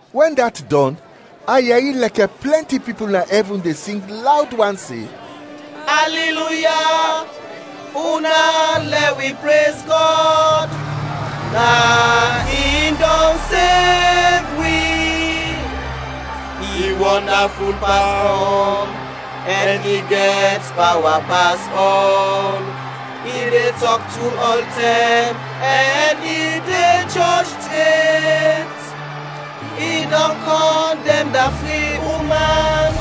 Wɛn dat dɔn, a yɛri lɛkɛ plɛnti pipul na ɛvin de sing lawd wan se, “Aliluya, una lɛ wi prez Gɔd, na in dɔn sev wi. I wɔndaful pas ɔl, ɛn i gɛt pawa pas ɔl! I de tɔk tru ɔltɛm, ɛn i de jɔj tret! I dɔn kɔndɛm da fri uman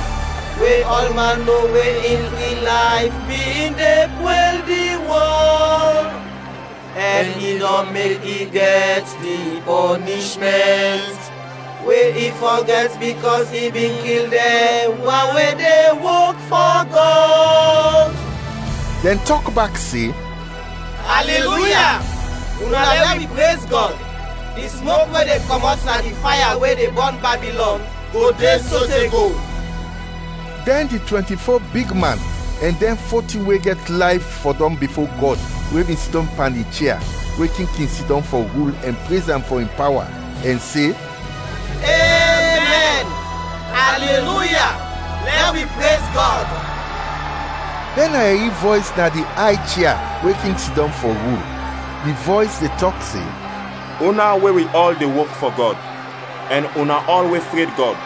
we ɔlman no we in fri layf bin de pwɛl di wɔl, ɛn i dɔn mek i gɛt di pɔnishmɛnt we i fɔ gɛt bikɔs i bin kil dɛn wan we de wok fɔ Gɔd.” Dɛn tɔk bak se, “Aliluya, una lɛ wi prez Gɔd, di smok we de kɔmɔt na di faya we de bɔn Babilɔn go de sote go.” Dɛn di twɛnti-fo bigman ɛn dɛn fo tin we gɛt layf fɔdɔm bifo Gɔd we bin sidɔm pan di chia we king kin sidɔm fɔ rul ɛn prez am fɔ in pawa, ɛn se, “Emɛn! Aliluya, lɛ wi prez Gɔd!” Dɛn a yɛri vɔys na di ay chia we king kin sidɔm fɔ rul. Di vɔys de tɔk se, “Una we wi ɔl de wok fɔ Gɔd, ɛn una ɔl we fred Gɔd,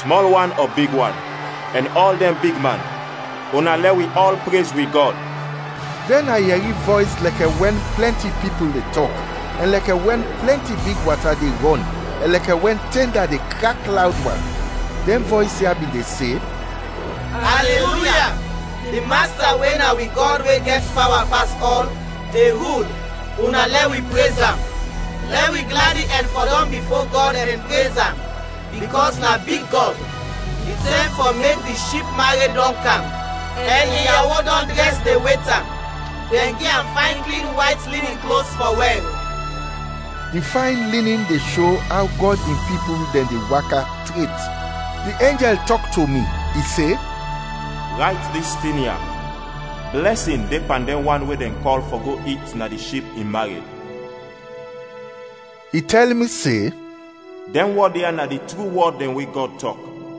smɔl wan ɔ big wan, ɛn ɔl dɛn bigman, una, lɛ wi ɔl prez wi Gɔd!” Dɛn a yɛri vɔys lɛkɛ wɛn plɛnti pipul de tɔk, ɛn lɛkɛ wɛn plɛnti big wata de rɔn ɛn lɛkɛ wɛn tɛnda de krak lawd wan; dɛn vɔys ya bin de se, “Aliluya! Di Masta, we na wi Gɔd we gɛt pawa pas ɔl, de rul, una lɛ wi prez am! Lɛ wi gladi ɛn fɔdɔm bifo Gɔd ɛn prez am, bikɔs na big Gɔd! Di tɛm fɔ mek di Ship mared dɔn kam, ɛn in yawo dɔn drɛs de wet am. Dɛn gi am fayn klin wayt linin klos fɔ wɛr.” (Di fayn linin de sho aw Gɔd in pipul dɛn de waka tret.) Di enjɛl tɔk to mi, i se, “Rayt dis tin ya: Blɛsin de pan dɛn wan we dɛn kɔl fɔ go it na di Ship in mared.” I tɛl mi se, “Dɛn wɔd ya na di tru wɔd dɛn we Gɔd tɔk.”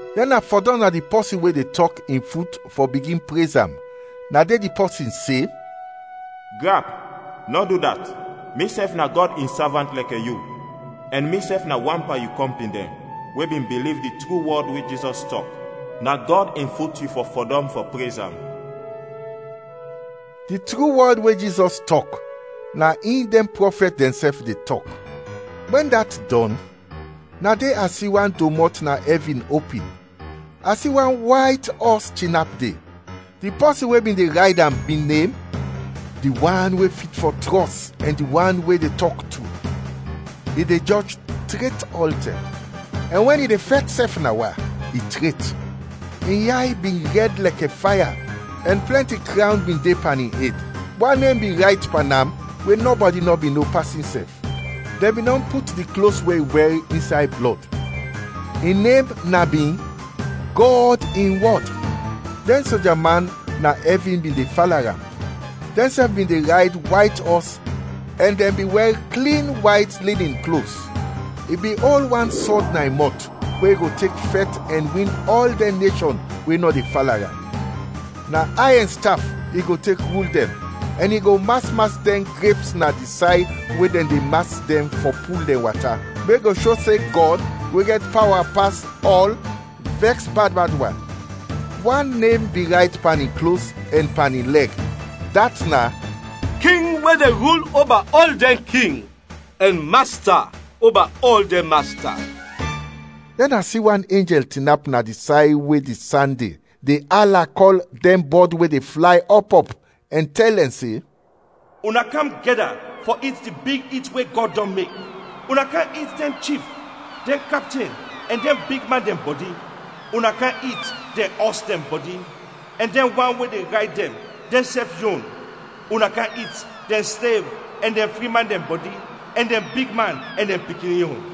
Dɛn a fɔdɔm na di pɔsin, we de tɔk, in fut fɔ bigin prez am. Na de di pɔsin se, “Grap, nɔ du dat! Misɛf na Gɔd in savant lɛkɛ yu, ɛn misɛf na wan pan yu kɔmpin dɛn we bin biliv di tru wɔd we Jizɔs tɔk! Na Gɔd in fut yu fɔ fɔdɔm fɔ prez am!” Di tru wɔd we Jizɔs tɔk, na in dɛn prɔfɛt dɛnsɛf de tɔk. Wɛn dat dɔn, na de a si wan domɔt na ɛvin opin, a si wan wayt ɔs tinap de, di pɔsin we bin de rayd am bin nem “Di wan we fit fɔ trɔs ɛn di wan we de tɔk tru”. I de jɔj tret ɔltɛm, ɛn wɛn i de fɛt sɛf na wa, i tret. In yay bin rɛd lɛkɛ faya ɛn plɛnti krawn bin de pan in ed. Wan nem bin rayt pan am we nɔbɔdi nɔ bin no pas insɛf. Dɛn bin dɔn put di klos we i wɛr insay blɔd. In nem na bin “Gɔd in Wɔd”. Dɛn soja man na ɛvin bin de fala am, dɛnsɛf bin de rayd wayt ɔs ɛn dɛn bin wɛr klin wayt linin klos. I bin ol wan sɔd na in mɔt, we i go tek fɛt ɛn win ɔl dɛn neshɔn we nɔ de fala am. Na ayɛn staf i go tek rul dɛn, ɛn i go mas mas dɛn greps na di say we dɛn de mas dɛn fɔ pul dɛn wata, we go sho se Gɔd, we gɛt pawa pas ɔl, vɛks bad bad wan. Wan nem bin rayt pan in klos ɛn pan in lɛg, dat na “King we de rul oba ɔl dɛn king, ɛn Masta oba ɔl dɛn masta.” Dɛn a si wan enjɛl tinap na di say we di san de, de ala kɔl ɔl dɛn bɔd we de flay ɔp ɔp, ɛn tɛl dɛn se, “Una kam gɛda fɔ it di big it we Gɔd dɔn mek; una kam it dɛn chif, dɛn kapten, ɛn dɛn bigman dɛn bɔdi. Una kam it dɛn ɔs dɛn bɔdi, ɛn dɛn wan we de rayd dɛn, dɛnsɛf yon; una kam it dɛn slev ɛn dɛn fri man dɛn bɔdi ɛn dɛn bigman ɛn dɛn pikin yon.”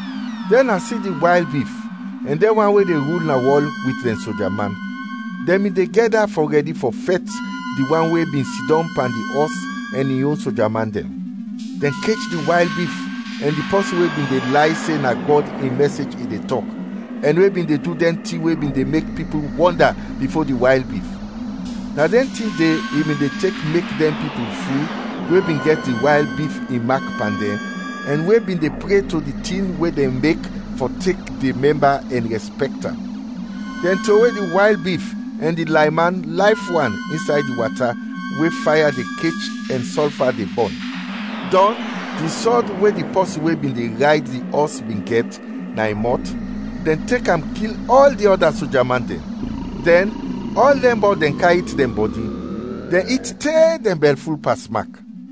Dɛn a si di wayl bif, ɛn dɛn wan we de rul na wɔl wit dɛn soja man. Dɛn bin de gɛda fɔ rɛdi fɔ fɛt di wan we bin sidɔm pan di ɔs ɛn in yon soja man dɛn. Dɛn kech di wayl bif ɛn di pɔsin we bin de lay se na Gɔd in mɛsej i de tɔk, ɛn we bin de du dɛn tin we bin de mek pipul wɔnda bifo di wayl bif. Na dɛn tin de i bin de tek mek dɛn pipul ful we bin gɛt di wayl bif in mak pan dɛn ɛn we bin de pre to di tin we dɛn mek fɔ tek de mɛmba ɛn rɛspɛkt am. Dɛn trowe di wayl bif ɛn di layman layf wan insay di wata we faya de kech ɛn sɔlfa de bɔn. Dɔn, di sɔd we di pɔsin we bin de rayd di ɔs bin gɛt, na in mɔt, dɛn tek am kil ɔl di ɔda soja man dɛn; dɛn, ɔl dɛn bɔd dɛn kam it dɛn bɔdi; dɛn it te dɛn bɛlful pasmak.